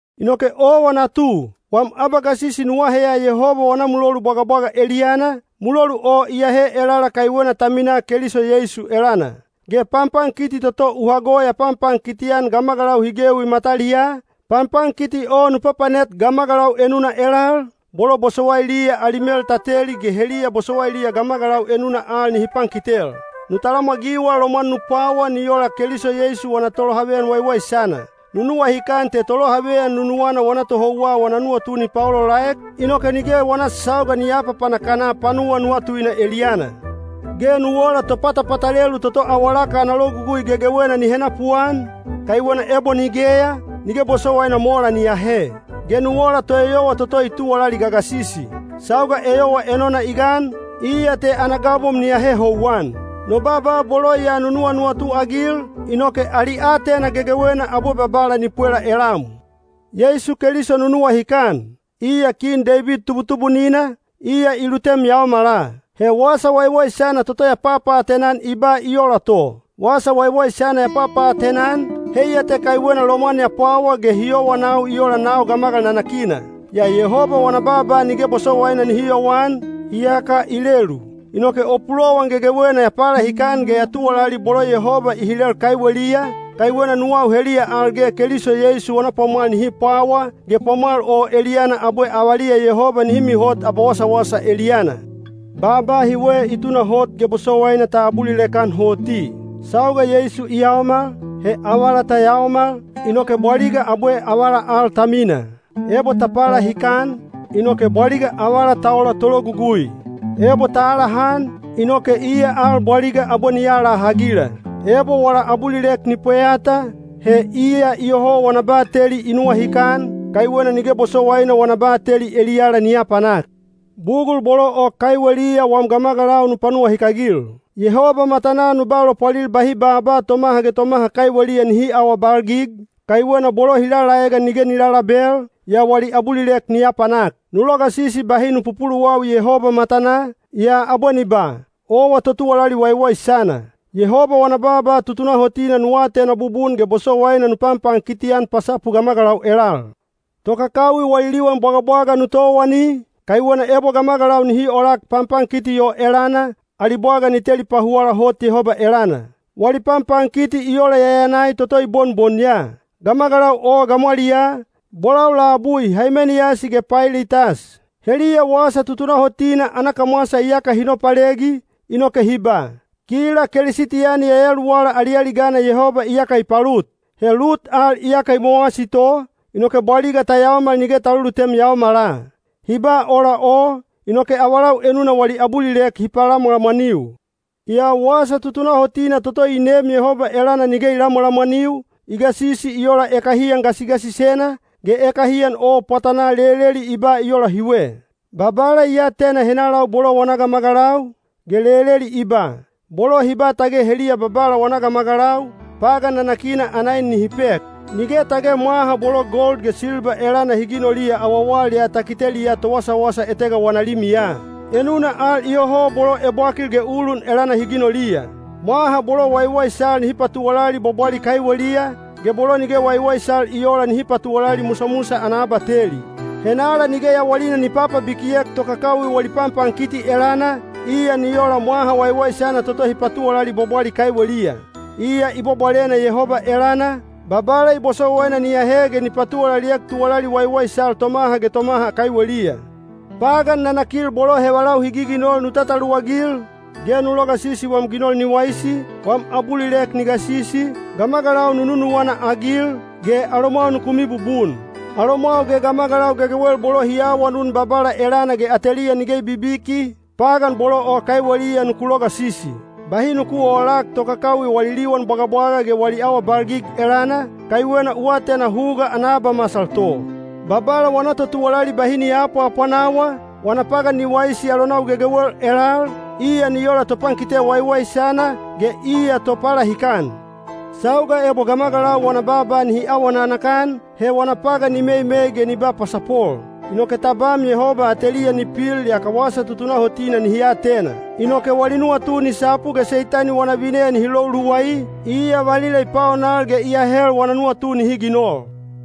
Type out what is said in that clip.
Inoke owa natu, wam abagasisi nu aheya Yehoba wana mulolu bwagabwaga eliyana, mulolu o iyahe elala kaiwena ta minaa Keliso Yeisu elana. Ge panpankiti toto u hago ya panpankiti-an gamagalau hi gewi mataliyaa, panpankiti o nu papanet gamagalau enuna elal, bolo bosowailiya ali mel ta teli ge heliya bosowailiya gamagalau enuna al nihi pankitel. Nu talamwagiwa lomwan nu pwawa ni ola Keliso Yeisu wana tolohaveyan waiwaisana. Nu nuwahikan te tolohaveyan nuwana wana tohouwa wana nuwatu ni paolaolaek, inoke nige wana sauga ni aapapanak-ana panuwa nuwatuina eliyana. Ge nu ola topatapatalelu toto awalaka ana logugui gegewena ni henapuan, kaiwena ebo nigeya, nige bosowaina mola ni ahe. Ge nu ola toeyowa toto i tuwalali gagasisi. Sauga eyowa enona i gan, iya te ana gabom ni ahe houwan. No baaba bolo ya nu nuwanuwatu-agil, inoke ali aatena gegewena abwe Babala ni pwela elam. Yeisu Keliso nu nuwahikan, iya Kin Deibid tubutubunina, iya i lutem yaomala. He Wasa Waiwaisana toto ya papaatena-an i ba i ola to. Wasa Waiwaisana ya papaatena-an, heiya te kaiwena lomwan ya pwawa ge hi yowanau i ola nau gamagal nanakina. Yaa Yehoba wana baaba nige bosowaina nihi yowan, iyaka i lelu. Inoke o pulowan gegewena ya palahikan ge ya tuwalali bolo Yehoba i hilel kaiweliya, kaiwena nuwau heliya al ge Keliso Yeisu wana pwamwal nihi pwawa, ge pwamwal o eliyana abwe avaliya Yehoba nihi mihot abawasawasa eliyana. Baaba hiwe i tunahot ge bosowaina ta abulilek-an hoti: Sauga Yeisu i yaomal, he avala ta yaomal, inoke bwaliga abwe avala al ta mina. Ebo ta palahikan, inoke bwaliga avala ta ola tologugui. Ebo ta alahan, inoke iya al bwaliga abwe ni alahagila. Ebo wala abulilek ni pweyata, he iya iyoho wana bateli i nuwahikan, kaiwena nige bosowaina wana bateli eliyala ni apanak. Bugul bolo o kaiweliya wam gamagalau nu panuwahikagil. Yehoba matanaa nu ba lopwalil bahi baaba tomaha ge tomaha kaiweliya nihi aawabalgig, kaiwena bolo hi lalaegan nige ni lalabel, yaa wali abulilek ni apanak. Nu logasisi bahi nu pupuluwawi Yehoba matanaa, yaa abwe ni ba, “Owa totuwalali waiwaisana.” Yehoba wana baaba tutunahotina nu atena bubun ge bosowaina nu panpankiti-an pasapu gamagalau elal. Tokakawi wali liwan bwagabwaga nu towani, kaiwena ebo gamagalau nihi olak panpankiti o elana, ali bwaga ni teli pahuwala hot Yehoba elana. Wali panpankiti i ola yayanai toto i bonbon ya. Gamagalau o gamwaliyaa, bolau labui Haimeniyasi ge Pailitas. Heliya wasa tutunahotina ana kamwasa iyaka hi nopalegi, inoke hi ba, “Kila Kelisitiyani yayaluwala alialigana Yehoba iyaka i palut. He lut al iyaka i mowasi to, inoke bwaliga ta yaomal nige ta lulutem yaomala.” Hi ba ola o, inoke avalau enuna wali abulilek hi palamwalamwaniu. Yaa wasa tutunahotina toto i neem Yehoba elana nige i lamwalamwaniu, i gasisi i ola ekahiyan gasigasisena, ge ekahiyan o pwatanaa leleli i ba i ola hiwe, “Babala i atena henalau bolo wana gamagalau”, ge leleli i ba, “Bolo hi ba tage heliya Babala wana gamagalau, pagan nanakina ana en nihi pek.” Nige tage mwaha bolo gold ge silba elana hi ginoliya awawal ya ta kiteliya towasawasa etega wana limiya. Enuna al iyoho bolo ebwakil ge ulun elana hi ginoliya. Mwaha bolo waiwaisal nihi patuwalali bwabwali kaiweliya, ge bolo nige waiwaisal i oola nihi patuwalali musamusa ana abateli. Henala nige yawalina ni papabikiek tokakawi wali panpankiti elana, iya ni ola mwaha waiwaisana toto hi patuwalali bwabwali kaiweliya. Iya i bwabwalena Yehoba elana, Babala i bosowaina ni ahe ge ni patuwalaliek tuwalali waiwaisal tomaha ge tomaha kaiweliya. Pagan nanakil bolo hevalau hi giginol nu tataluwagil, ge nu logasisi wam ginol ni waisi, wam abulilek ni gasisi, gamagalau nu nunuwana-agil, ge alomwau nuku mibubun. Alomwau ge gamagalau gegewel bolo hi awanun Babala elana ge ateliya nige i bibiki, pagan bolo o kaiweliya nuku logasisi. Bahi nu oolak tokakawi wali liwan bwagabwaga ge wali awabalgig elana, kaiwena u atena huga ana abamasal to. Babala wana totuwalali bahi ni aapwaapwanawa, wana pagan ni waisi alonau gegewel elal, iya ni ola topankite waiwaisana, ge iya topalahikan. Sauga ebo gamagalau wana baaba nihi awa nanakan, he wana pagan ni meimei ge ni ba pasapol. Inoke tabam Yehoba ateliya ni pil yaka wasa tutunahotina nihi atena. Inoke wali nuwatu ni sapu ge Seitani wana vineya nihi lou luwai, iya valila i paonal ge i ahel wana nuwatu nihi ginol.